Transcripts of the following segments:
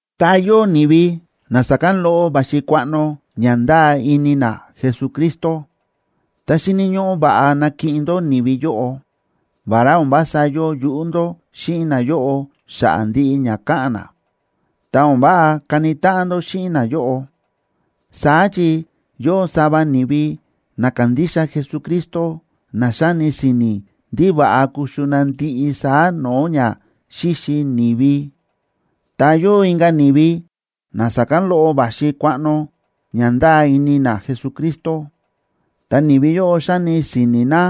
Tá yóo ni̱vi na sa̱kán loꞌo va̱xi kuaꞌno ña ndáa ini na Jesucristo, ta xíni̱ ñóꞌó va̱ꞌa nakiꞌin ndó ni̱vi yóꞌo. Vará o̱n vása yóo yuꞌú ndó xíꞌin nayóꞌo xa̱ꞌa̱ ndiꞌi ña káꞌa̱n na, ta o̱n váꞌa kani táꞌan ndó xíꞌin nayóꞌo. Saá chi yóo sava ni̱vi na kándixa Jesucristo na xáni si̱ni̱ ndí va̱ꞌa kuxu na ndiꞌi saá no̱o̱ ña xíxi ni̱vi. Ta yóo inka̱ ni̱vi na sa̱kán loꞌo va̱xi kuaꞌno ña ndáa ini na Jesucristo, ta ni̱vi yóꞌo xáni si̱ni̱ na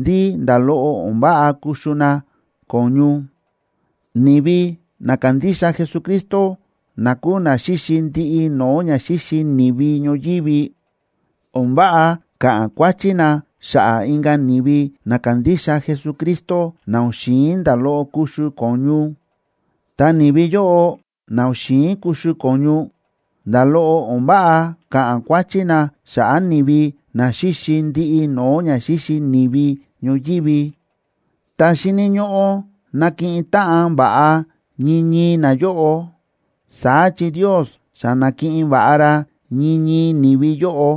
ndí nda̱ loꞌo o̱n váꞌa kuxu na ko̱ñu. Ni̱vi na kándixa Jesucristo na kúu na xíxi ndiꞌi no̱o̱ ña xíxi ni̱vi ñoyívi, o̱n váꞌa ka̱ꞌa̱n kuáchí na xa̱ꞌa̱ inka̱ ni̱vi na kándixa Jesucristo na o̱n xi̱in nda̱ loꞌo kuxu ko̱ñu. Ta ni̱vi yóꞌo na o̱n xi̱in kuxu ko̱ñu, nda̱ loꞌo o̱n váꞌa ka̱ꞌa̱n kuáchí na xa̱ꞌa̱ ni̱vi na xíxi ndiꞌi no̱o̱ ña xíxi ni̱vi ñoyívi. Ta xíni̱ ñóꞌó nakiꞌin táꞌan va̱ꞌa ñii ñii nayóꞌo, saá chi Ndios xa na̱kiꞌin va̱ꞌa ra ñii ñii ni̱vi yóꞌo.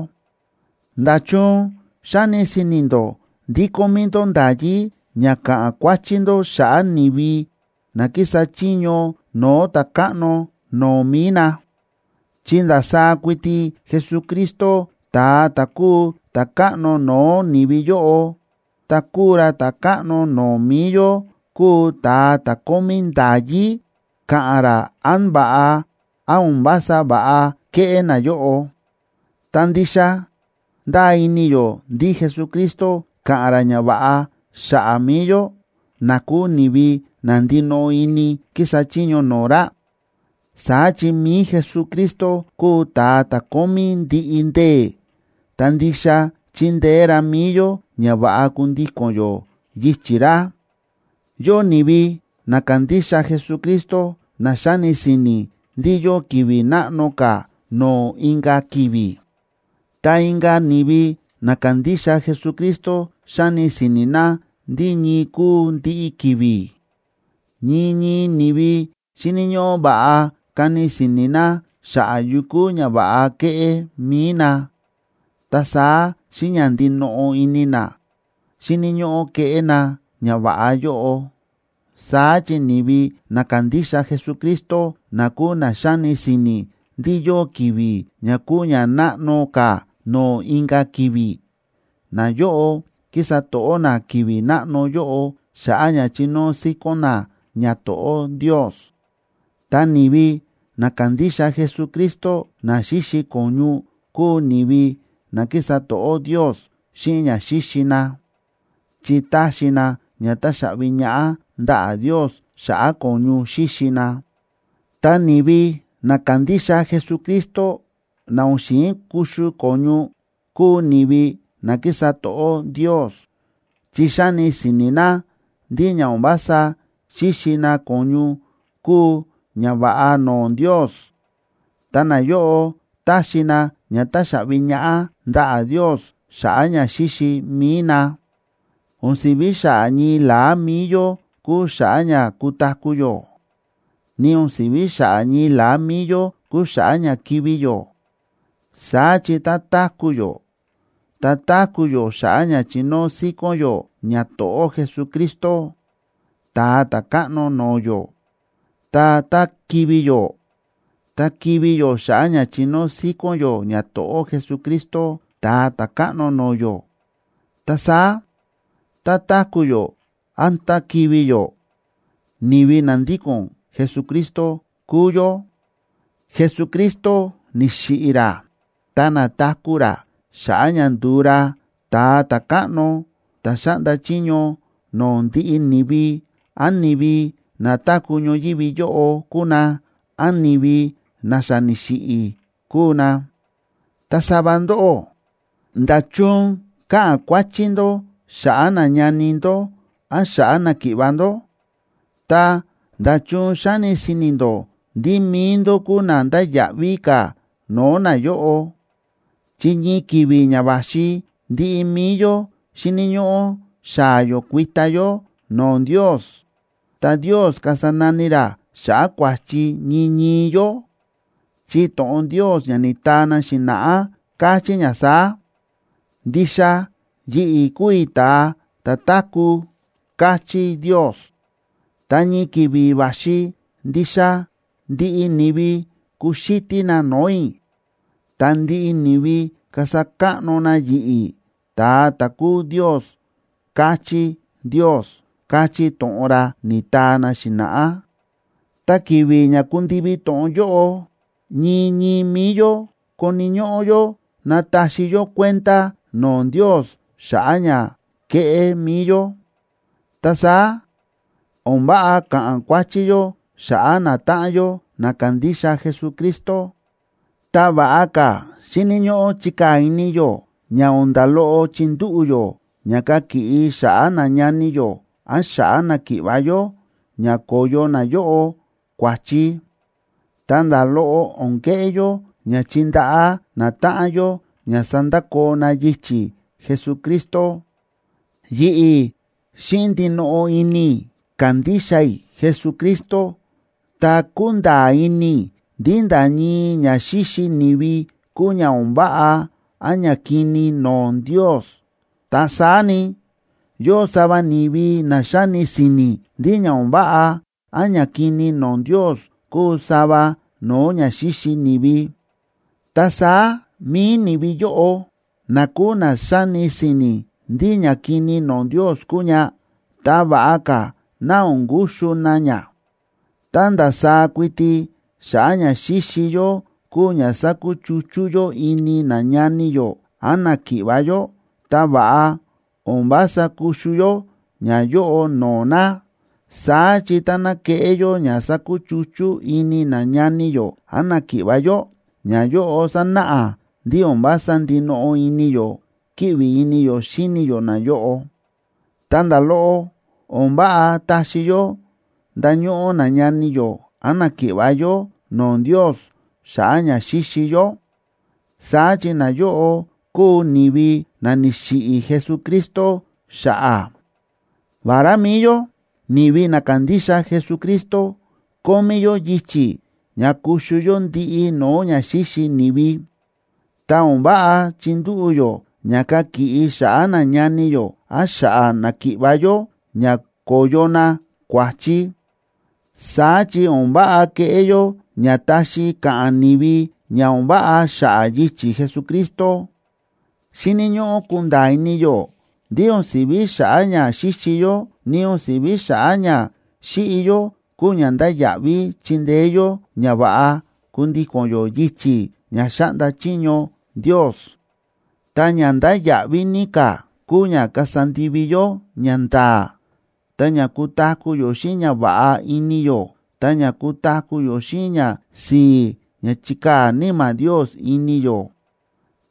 ¿Nda̱chun xáni si̱ni̱ ndó ndí kómí ndó nda̱yí ña ka̱ꞌa̱n kuáchí ndó xa̱ꞌa̱ ni̱vi na kísa chiño no̱o̱ ta̱káꞌno no̱o̱ mi̱i na? Chi ndasaá kuiti Jesucristo, ta̱a ta̱ kúu ta̱káꞌno no̱o̱ ni̱vi yóꞌo, ta kúu ra ta̱káꞌno no̱o̱ mi̱i yó, kúu ta̱a ta̱ kómí nda̱yí ka̱ꞌa̱n ra án va̱ꞌa, án o̱n vása va̱ꞌa kéꞌé nayóꞌo. Ta ndixa ndáa ini yó ndí Jesucristo káꞌa̱n ra ñava̱ꞌa xa̱ꞌa̱ mi̱i yó, na kúu ni̱vi na ndinoꞌo ini kísa chiño no̱o̱ ra. Saá chi mi̱i Jesucristo kúu ta̱a ta̱ kómí ndiꞌi ndee̱, ta ndixa chindeé ra mi̱i yó ña va̱ꞌa kundíko̱n yó yichi̱ ra. Yóo ni̱vi na kándixa Jesucristo na xáni si̱ni̱ ndí yóo ki̱vi̱ náꞌno ka̱ no̱o̱ inka̱ ki̱vi̱. Ta inka̱ ni̱vi na kándixa Jesucristo xáni si̱ni̱ na ndí ñii kúu ndiꞌi ki̱vi̱. Ñii ñii ni̱vi xíni̱ ñóꞌó va̱ꞌa kani si̱ni̱ na xa̱ꞌa̱ yu kúu ñava̱ꞌa keꞌé mi̱i na, ta saá xíꞌin ña ndinoꞌo ini na, xíni̱ ñóꞌó keꞌé na ñava̱ꞌa yóꞌo. Saá chi ni̱vi na kándixa Jesucristo, na kúu na xáni si̱ni̱ ndí yóo ki̱vi̱ ña kúu ña náꞌno ka̱ no̱o̱ inka̱ ki̱vi̱, nayóꞌo kísa to̱ꞌó na ki̱vi̱ náꞌno yóꞌo xa̱ꞌa̱ ña chinóo síkón na ñato̱ꞌó Ndios. Ta ni̱vi na kándixa Jesucristo na xíxi ko̱ñu kúu ni̱vi na kísa to̱ꞌó Ndios xíꞌin ña xíxi na, chi táxi na ña táxaꞌvi ñaꞌá ndaꞌa̱ Ndios xa̱ꞌa̱ ko̱ñu xíxi na. Ta ni̱vi na kándixa Jesucristo, na o̱n xi̱in kuxu ko̱ñu, kúu ni̱vi na kísa to̱ꞌó Ndios, chi xáni si̱ni̱ na ndí ña o̱n vása xíxi na ko̱ñu kúu ñava̱ꞌa no̱o̱ Ndios, ta nayóꞌo táxi na ña táxaꞌvi ñaꞌá ndaꞌa̱ Ndios xa̱ꞌa̱ ña xíxi mi̱i na. O̱n si̱ví xa̱ꞌa̱ ñii la̱á mi̱i yó kúu xa̱ꞌa̱ ña kutaku̱ yó; ni o̱n si̱ví xa̱ꞌa̱ ñii la̱á mi̱i yó kúu xa̱ꞌa̱ ña kivi̱ yó. Saá chi tá táku̱ yó, ta táku̱ yó xa̱ꞌa̱ ña chinóo síkón yó ñato̱ꞌó Jesucristo, Ta̱a Ta̱káꞌno no̱o̱ yó. Ta tá kivi̱ yó, ta kivi̱ yó xa̱ꞌa̱ ña chinóo síkón yó ñato̱ꞌó Jesucristo, Ta̱a Ta̱káꞌno no̱o̱ yó. Ta saá tá táku̱ yó án tá kivi̱ yó, ni̱vi na ndíko̱n Jesucristo kúu yó. Jesucristo ni̱xiꞌi̱ ra ta na̱taku̱ ra xa̱ꞌa̱ ña ndu̱u ra Ta̱a Ta̱káꞌno ta̱ xáꞌnda chiño no̱o̱ ndiꞌi ni̱vi, án ni̱vi na táku̱ ñoyívi yóꞌo kúu na, án ni̱vi na xa ni̱xiꞌi̱ kúu na. Ta sava ndóꞌó, ¿nda̱chun káꞌa̱n kuáchí ndó xa̱ꞌa̱ nañani ndó án xa̱ꞌa̱ náki̱ꞌva̱ ndó? Ta, ¿nda̱chun xáni si̱ni̱ ndó ndí mi̱i ndó kúu na ndáya̱ꞌví ka̱ no̱o̱ nayóꞌo? Chi ñii ki̱vi̱ ña va̱xi ndiꞌi mi̱i yó xíni̱ ñóꞌó xaa̱ yó kuita yó no̱o̱ Ndios, ta Ndios kasa nani ra xa̱ꞌa̱ kua̱chi ñii ñii yó. Chi to̱ꞌon Ndios ña ni̱taa na xi̱na̱ꞌá káchí ña saá: “Ndixa yi̱ꞌi̱ kúu i̱ ta̱a ta̱ táku̱”, káchí Ndios, “ta ñii ki̱vi̱ va̱xi ndixa ndiꞌi ni̱vi kuxítí na no̱o̱ i̱, ta ndiꞌi ni̱vi kasa káꞌno na yi̱ꞌi̱, ta̱a ta̱ kúu Ndios”, káchí Ndios, káchí to̱ꞌon ra ni̱taa na xi̱na̱ꞌá. Ta ki̱vi̱ ña kundivi to̱ꞌon yóꞌo, ñii ñii mi̱i yó koni̱ ñóꞌó yó nataxi yó kuenda no̱o̱ Ndios xa̱ꞌa̱ ña ke̱ꞌé mi̱i yó. Ta saá o̱n váꞌa ka̱ꞌa̱n kuáchí yó xa̱ꞌa̱ natáꞌan yó, na kándixa Jesucristo, ta va̱ꞌa ka̱ xíni̱ ñóꞌó chikaa̱ ini yó ña o̱n nda̱ loꞌo chindúꞌu̱ yó ña kakiꞌi xa̱ꞌa̱ nañani yó án xa̱ꞌa̱ náki̱ꞌva̱ yó, ña ko̱yo nayóꞌo kua̱chi. Ta nda̱ loꞌo o̱n keꞌé yó ña chindaꞌá natáꞌan yó ña sandakoo na yichi̱ Jesucristo. Yi̱ꞌi̱ xíꞌin ndinoꞌo ini i̱ kándixa i̱ Jesucristo, ta kúnda̱a̱ ini i̱ ndí nda̱ ñii ña xíxi ni̱vi kúu ña o̱n váꞌa án ñakini no̱o̱ Ndios. Ta saá ni, yóo sava ni̱vi na xáni si̱ni̱ ndí ña o̱n váꞌa án ñakini no̱o̱ Ndios kúu sava no̱o̱ ña xíxi ni̱vi. Ta saá mi̱i ni̱vi yóꞌo na kúu na xáni si̱ni̱ ndí ñakini no̱o̱ Ndios kúu ña, ta va̱ꞌa ka̱ ná o̱n kuxu na ña. Tá ndasaá kuiti xa̱ꞌa̱ ña xíxi yó kúu ña sákuchuchú yó ini nañani yó án náki̱ꞌva̱ yó, ta va̱ꞌa o̱n vása kuxu yó ñayóꞌo no̱o̱ na. Saá chi táná keꞌé yó ña sakuchuchú ini nañani yó án náki̱ꞌva̱ yó, ñayóꞌo sanáꞌa ndí o̱n vása ndinoꞌo ini yó kíꞌvi ini yó xíni yó nayóꞌo. Ta nda̱ loꞌo o̱n váꞌa taxi yó ndañóꞌó nañani yó án náki̱ꞌva̱ yó no̱o̱ Ndios xa̱ꞌa̱ ña xíxi yó. Saá chi nayóꞌo kúu ni̱vi na ni̱xiꞌi̱ Jesucristo xa̱ꞌa̱. Vará mi̱i yó ni̱vi na kándixa Jesucristo kómí yó yichi̱ ña kuxu yó ndiꞌi no̱o̱ ña xíxi ni̱vi, ta o̱n váꞌa chindúꞌu̱ yó ña kakiꞌi xa̱ꞌa̱ nañani yó án xa̱ꞌa̱ náki̱ꞌva̱ yó ña ko̱yo na kua̱chi. Saá chi o̱n váꞌa keꞌé yó ña taxi ka̱ꞌa̱n ni̱vi ña o̱n váꞌa xa̱ꞌa̱ yichi̱ Jesucristo. Xíni̱ ñóꞌó kunda̱a̱ ini yó ndí o̱n si̱ví xa̱ꞌa̱ ña xíxi yó, ni o̱n si̱ví xa̱ꞌa̱ ña xíꞌi yó kúu ña ndáya̱ꞌví chindeé yó ña va̱ꞌa kundíko̱n yó yichi̱ ña xáꞌnda chiño Ndios. Ta ña ndáya̱ꞌví ní ka̱ kúu ña kasa ndivi yó ñanda̱a̱, ta ña kutaku̱ yó xíꞌin ñava̱ꞌa ini yó, ta ña kutaku̱ yó xíꞌin ñasi̱i̱ ña chíkaa̱ Níma̱ Ndios ini yó.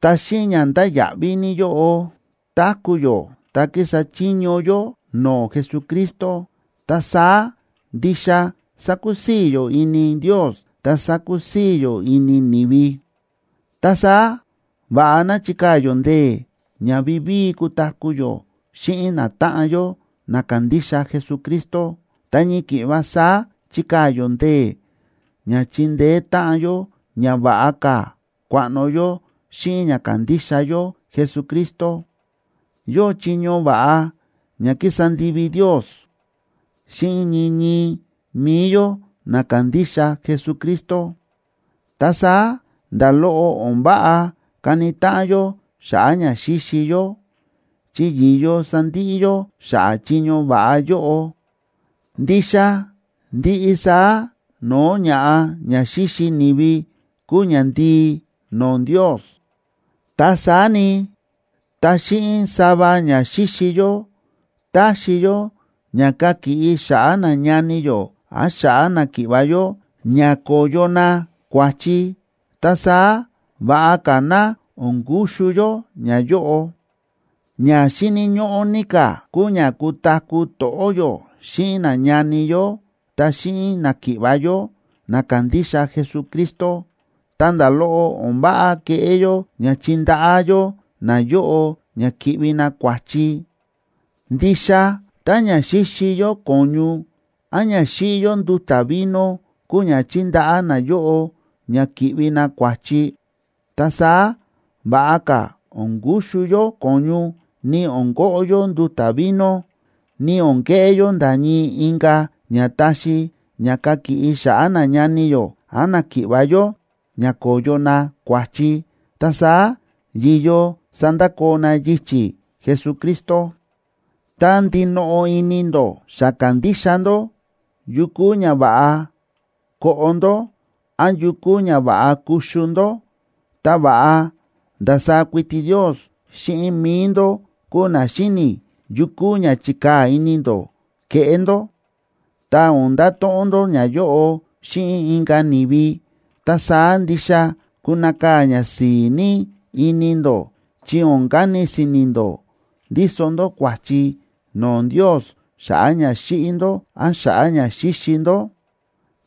Tá xíꞌin ña ndáya̱ꞌví ní yóꞌo táku̱ yó ta kísa chiño yó no̱o̱ Jesucristo, ta saá ndixa sakusii̱ yó ini Ndios, ta sakusii̱ yó ini ni̱vi. Ta saá va̱ꞌa ná chikaa̱ yó ndee̱ ña vivíi kutaku̱ yó xíꞌin natáꞌan yó na kándixa Jesucristo, ta ñii ki̱ꞌva saá chikaa̱ yó ndee̱ ña chindeé táꞌan yó ña va̱ꞌa ka̱ kuaꞌno yó xíꞌin ña kándixa yó Jesucristo. Yóo chiño va̱ꞌa ña ki̱sa ndivi Ndios xíꞌin ñii ñii mi̱i yó na kándixa Jesucristo. Ta saá nda̱ loꞌo o̱n váꞌa kani táꞌan yó xa̱ꞌa̱ ña xíxi yó, chi yi̱yo sandiꞌi yó xa̱ꞌa̱ chiño va̱ꞌa yóꞌo. Ndixa ndiꞌi saá no̱o̱ ña̱ꞌa ña xíxi ni̱vi kúu ñandii no̱o̱ Ndios. Ta saá ni, tá xíꞌin sava ña xíxi yó taxi yó ña kakiꞌi xa̱ꞌa̱ nañani yó án xa̱ꞌa̱ náki̱ꞌva̱ yó ña ko̱yo na kua̱chi, ta saá va̱ꞌa ka̱ ná o̱n kuxu yó ñayóꞌo. Ña xíni̱ ñóꞌó ní ka̱ kúu ña kutaku̱ to̱ꞌó yó xíꞌin nañani yó ta xíꞌin náki̱ꞌva̱ yó na kándixa Jesucristo, ta nda̱ loꞌo o̱n váꞌa keꞌé yó ña chindaꞌá yó nayóꞌo ña ki̱ꞌvi na kua̱chi. Ndixa tá ña xíxi yó ko̱ñu án ña xíꞌi yó nduta̱ vino kúu ña chindaꞌá nayóꞌo ña ki̱ꞌvi na kua̱chi, ta saá va̱ꞌa ka̱ o̱n kuxu yó ko̱ñu, ni o̱n koꞌo yó nduta̱ vino, ni o̱n keꞌé yó nda̱ ñii inka̱ ña taxi ña kakiꞌi xa̱ꞌa̱ nañani yó án náki̱ꞌva̱ yó ña ko̱yo na kua̱chi, ta saá yi̱yo sandakoo na yichi̱ Jesucristo. Tá ndinoꞌo ini ndó xa kándixa ndó yu kúu ña va̱ꞌa koꞌo ndó án yu kúu ña va̱ꞌa kuxu ndó, ta va̱ꞌa ndasaá kuiti Ndios xíꞌin mi̱i ndó kuu na xíni̱ yu kúu ña chikaa̱ ini ndó keꞌé ndó, ta o̱n ndato̱ꞌon ndó ñayóꞌo xíꞌin inka̱ ni̱vi. Ta saá ndixa kunakaa̱ ñasi̱i̱ ní ini ndó, chi o̱n kani si̱ni̱ ndó ndíso ndó kua̱chi no̱o̱ Ndios xa̱ꞌa̱ ña xíꞌi ndó án xa̱ꞌa̱ ña xíxi ndó.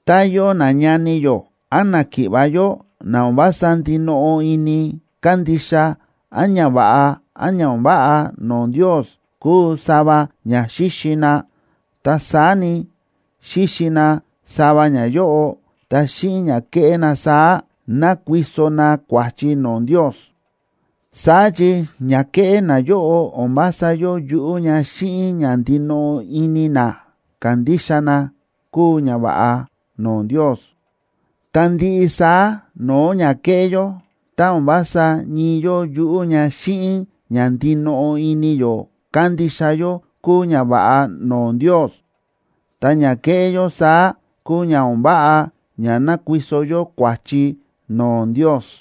Tá yóo nañani yó án náki̱ꞌva̱ yó, na o̱n vása ndinoꞌo ini kándixa án ñava̱ꞌa án ña o̱n váꞌa no̱o̱ Ndios kúu sava ña xíxi na, ta saá ni, xíxi na sava ñayóꞌo, ta xíꞌin ña kéꞌé na saá, nákuiso na kua̱chi no̱o̱ Ndios. Saá chi ña kéꞌé nayóꞌo o̱n vása yóo yuꞌú ña xíꞌin ña ndinoꞌo ini na kándixa na kúu ñava̱ꞌa no̱o̱ Ndios. Ta ndiꞌi saá no̱o̱ ña kéꞌé yó, tá o̱n vása ñii yóo yuꞌú ña xíꞌin ña ndinoꞌo ini yó kándixa yó kúu ñava̱ꞌa no̱o̱ Ndios, ta ña kéꞌé yó saá kúu ña o̱n váꞌa ña nákuiso yó kua̱chi no̱o̱ Ndios.